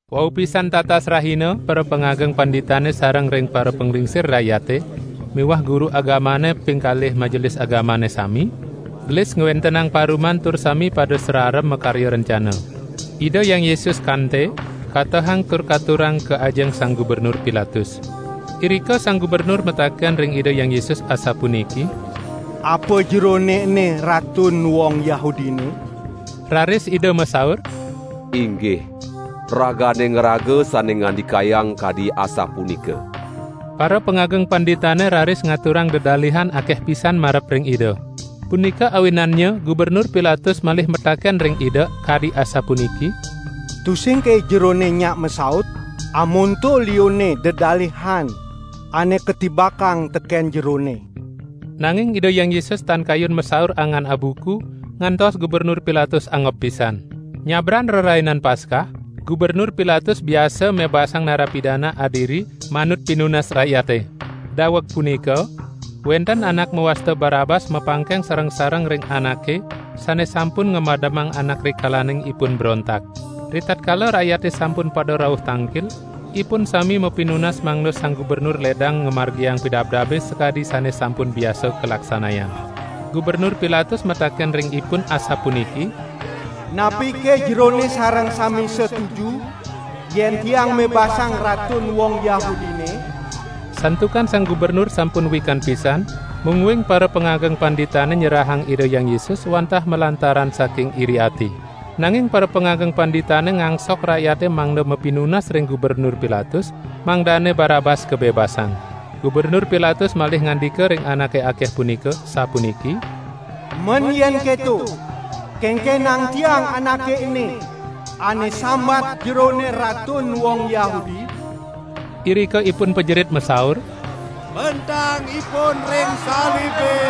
Wau pisan tatas rahina parapangageng panditane sareng ring parapanglingsir rakyate miwah guru agamane ping kalih Majelis Agamane sami, gelis ngwentenang paruman tur sami pada sararem makarya rencana. Ida Hyang Yesus kaante, katehang tur katurang ka ajeng Sang Gubernur Pilatus. Irika sang gubernur mataken ring Ida Hyang Yesus asapuniki: "Apa Jerone ene Ratun wong Yahudine?" Raris Ida masaur: "Inggih ragane ngraga sane ngandikayang kadi asapunika." Parapangageng panditane raris ngaturang dedalihan akeh pisan marep ring Ida. Punika awinannya Gubernur Pilatus malih mataken ring Ida kadi asapuniki: "Tusingke Jerone nyak masaut? Amonto liunne dedalihan ane katibakang teken Jerone." Nanging Ida Hyang Yesus tan kayun masaur angan abuku, ngantos Gubernur Pilatus angob pisan. Nyabran Rerainan Paskah, Gubernur Pilatus biasa mebasang narapidana adiri manut pinunas rakyate. Daweg punika, wenten anak mawasta Barabas mapangkeng sareng-sareng ring anake sane sampun ngamademang anak rikalaning ipun brontak. Ritatkala rakyate sampun pada rauh tangkil, ipun sami mapinunas mangda sang gubernur ledang ngamargiang pidabdabe sakadi sane sampun biasa kalaksanayang. Gubernur Pilatus mataken ring ipun asapuniki: "Napike jerone sareng sami setuju, yen tiang mebasang Ratun wong Yahudine?" Santukan sang gubernur sampun wikan pisan, mungguing parapangageng panditane nyerahang Ida Hyang Yesus wantah malantaran saking iri ati. Nanging parapangageng panditane ngangsok rakyate mangda mapinunas ring Gubernur Pilatus mangdane Barabas kabebasang. Gubernur Pilatus malih ngandika ring anake akeh punika sapuniki: "Men yen keto, kenkenang tiang Anake ene, ane sambat jerone Ratun wong Yahudi?" Irika ipun pajerit masaur: "Pentang Ipun ring salibe!"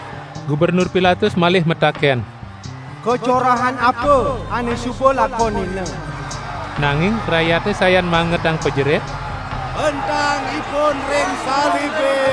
Gubernur Pilatus malih mataken: "Kacorahan apa ane suba lakonina?" Nanging rakyate sayan mangetang pajerit: "Pentang Ipun ring salibe!"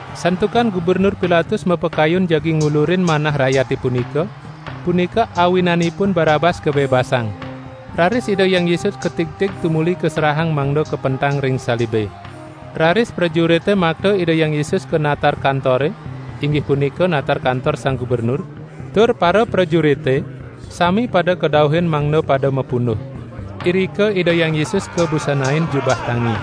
Santukan Gubernur Pilatus mapakayun jagi ngulurin manah rakyate punika, punika awinanipun Barabas kabebasang. Raris Ida Hyang Yesus katigtig tumuli kaserahang mangda kapentang ring salibe. Raris prajurite makta Ida Hyang Yesus ka natar kantore (inggih punika natar kantor sang gubernur) tur paraprajurite sami pada kadauhin mangda pada mapunduh. Irika Ida Hyang Yesus kabusanain jubah tangi.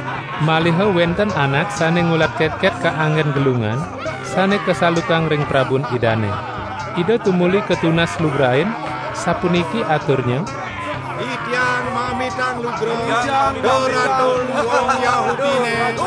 Maliha wenten anak sane ngulat ketket kanggen gelungan sane kasalukang ring prabun Idane. Ida tumuli katunas lugrain, sapuniki aturnya: "Titiang mamitang lugra, duh Ratun wong Yahudine!"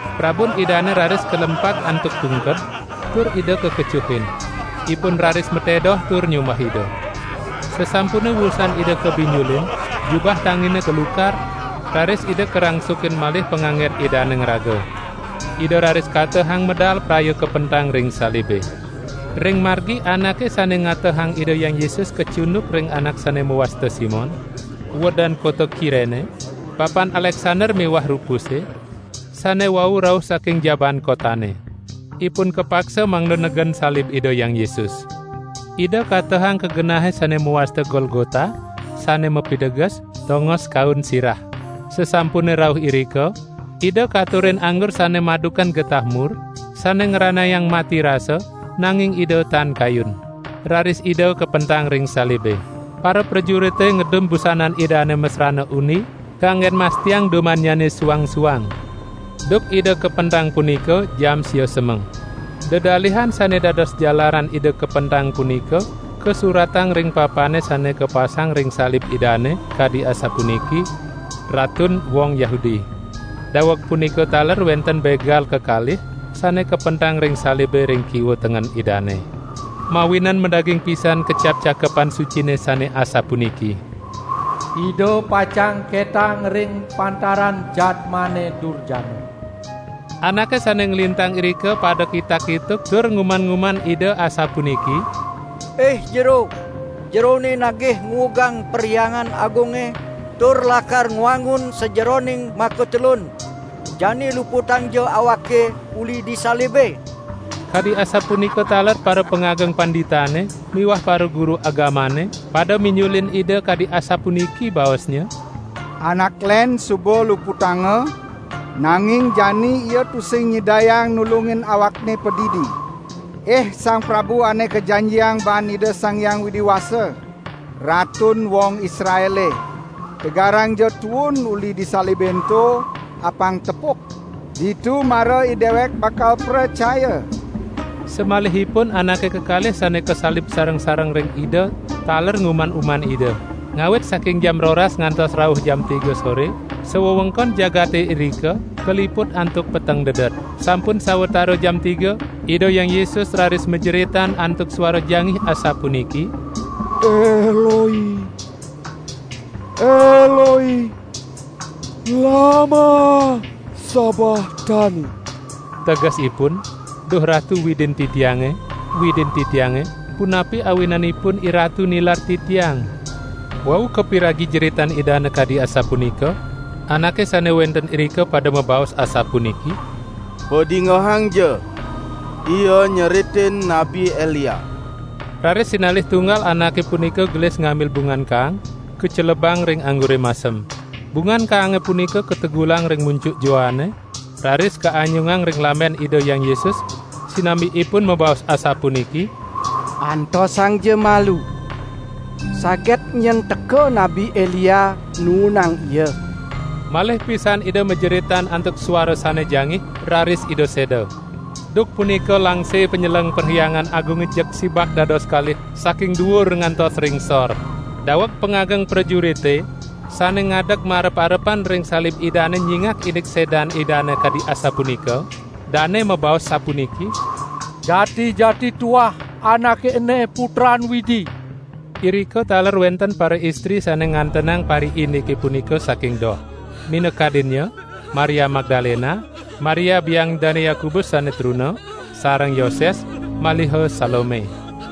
Prabun Idane raris kalempag antuk tungked tur Ida kakecuhin. Ipun raris matedoh tur nyumbah Ida. Sasampune wusan Ida kabinjulin, jubah tangine katukar, raris Ida karangsukin malih panganggen Idane ngraga. Ida raris katehang medal praya kapentang ring salibe. Ring margi anake sane ngatehang Ida Hyang Yesus kacunduk ring anak sane mawasta Simon, uedan kota Kirene, bapan Aleksander miwah Rupuse, sane wau rauh saking jabaan kotane. Ipun kapaksa mangda negen salib Ida Hyang Yesus. Ida katehang ka genahe sane mawasta Golgota, sane mapiteges "Tongos Kaun Sirah". Sasampune rauh irika, Ida katurin anggur sane madukan getah mur sane ngranayang mati rasa, nanging Ida tan kayun. Raris Ida kapentang ring salibe. Paraprajurite ngedum busanan Idane masrana undi, kanggen mastiang dumannyane suang-suang. Duk Ida kapentang punika jam sia semeng. Dedalihan sane dados jalaran Ida kapentang punika kasuratang ring papane sane kapasang ring salib Idane, kadi asapuniki: "Ratun wong Yahudi". Daweg punika taler wenten begal kekalih, sane kapentang ring salibe ring kiwa tengen Idane. [ Mawinan madaging pisan kecap Cakepan Sucine sane asapuniki: "Ida pacang ketang ring pantaran jadmane durjana."] Anake sane nglintang irika pada kitak-kituk tur nguman-uman Ida asapuniki: "Ih Jero, Jerone nagih nguugang Perhyangan Agunge tur lakar ngwangun sajeroning makatelun, jani luputangja Awake uli di salibe!" Kadi asapunika taler parapangageng panditane miwah paraguru agamane pada minjulin Ida kadi asapuniki baosnya: "Anak len suba luputanga, nanging jani Ia tusing nyidayang nulungin Awakne padidi! Ih Sang Prabu Ane Kajanjiang baan Ida Sang Hyang Widi Wasa, Ratun wong Israele, tegarangja tuun uli di salibe ento, apang tepuk, ditu mara idewek bakal pracaya!" Samalihipun anake kekalih sane kasalib sareng-sareng ring Ida taler nguman-uman Ida. Ngawit saking jam roras ngantos rauh jam tiga sore, sawewengkon jagate irika kaliput antuk peteng dedet. Sampun sawatara jam tiga Ida Hyang Yesus raris majeritan antuk suara jangih asapuniki: "Eloi, Eloi, lama sabahtani!", tegesipun: "Duh Ratu Widin Titiange, Widin Titiange, punapi awinanipun IRatu nilar Titiang?" Wau kapiragi jeritan Idane kadi asapunika, anake sane wenten irika pada mabaos asapuniki: "Padingehangja! Ia nyeritin Nabi Elia!" Raris sinalih tunggal anake punika gelis ngambil bungan kaang, kacelebang ring anggure masem. Bungan kaange punika kategulang ring muncuk joane, raris kaanyungang ring lamben Ida Hyang Yesus, sinambi ipun mabaos asapuniki: "Antosangja malu, saget nyen teka Nabi Elia nuunang Ia!" Malih pisan Ida majeritan antuk suara sane jangih, raris Ida seda. Duk punika langse panyeleng Perhyangan Agunge jeg sibak dados kalih saking duur ngantos ring sor. Daweg pangageng prajurite sane ngadeg marep-arepan ring salib Idane nyingak indik sedan Idane kadi asapunika, dane mabaos sapuniki: "Jati-jati tuah Anake ene Putran Widi!" Irika taler wenten paraistri sane ngantenang pariindike punika saking doh. Minakadinnya, Maria Magdalena, Maria biang Dane Yakobus sane truna, sareng Yoses, maliha Salome.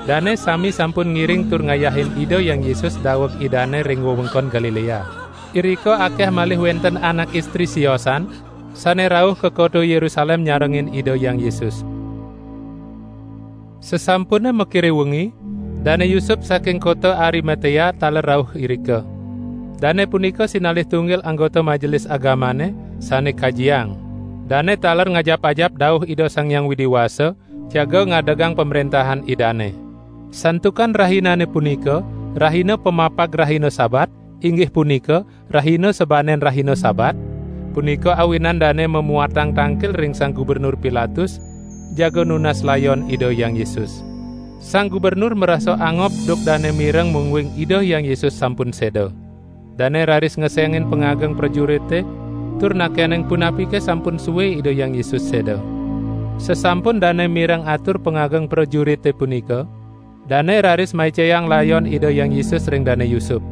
Dane sami sampun ngiring tur ngayahin Ida Hyang Yesus daweg Idane ring wewengkon Galilea. Irika akeh malih wenten anak istri siosan sane rauh ka kota Yerusalem nyarengin Ida Hyang Yesus. Sasampune makire wengi, Dane Yusup saking kota Arimatea taler rauh irika. Dane punika sinalih tunggil anggota Majelis Agamane, sane kajiang. Dane taler ngajap-ajap dauh Ida Sang Hyang Widi Wasa jaga ngadegang Pamrentahan Idane. Santukan rahinane punika rahina pamapag rahina Sabat (rahina sabanen rahina Sabat), punika awinan dane mamuatang tangkil ring Sang Gubernur Pilatus jaga nunas layon Ida Hyang Yesus. Sang gubernur marasa angob duk dane mireng mungguing Ida Hyang Yesus sampun seda. Dane raris ngesengin pangageng prajurite tur nakenang punapike sampun sue Ida Hyang Yesus seda. Sasampun dane mireng atur pangageng prajurite punika, dane raris maicayang layon Ida Hyang Yesus ring Dane Yusup.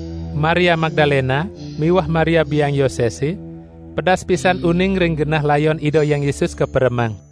Maria Magdalena miwah Maria biang Yosese, pedas pisan uning ring genah layon Ida Hyang Yesus kaperemang.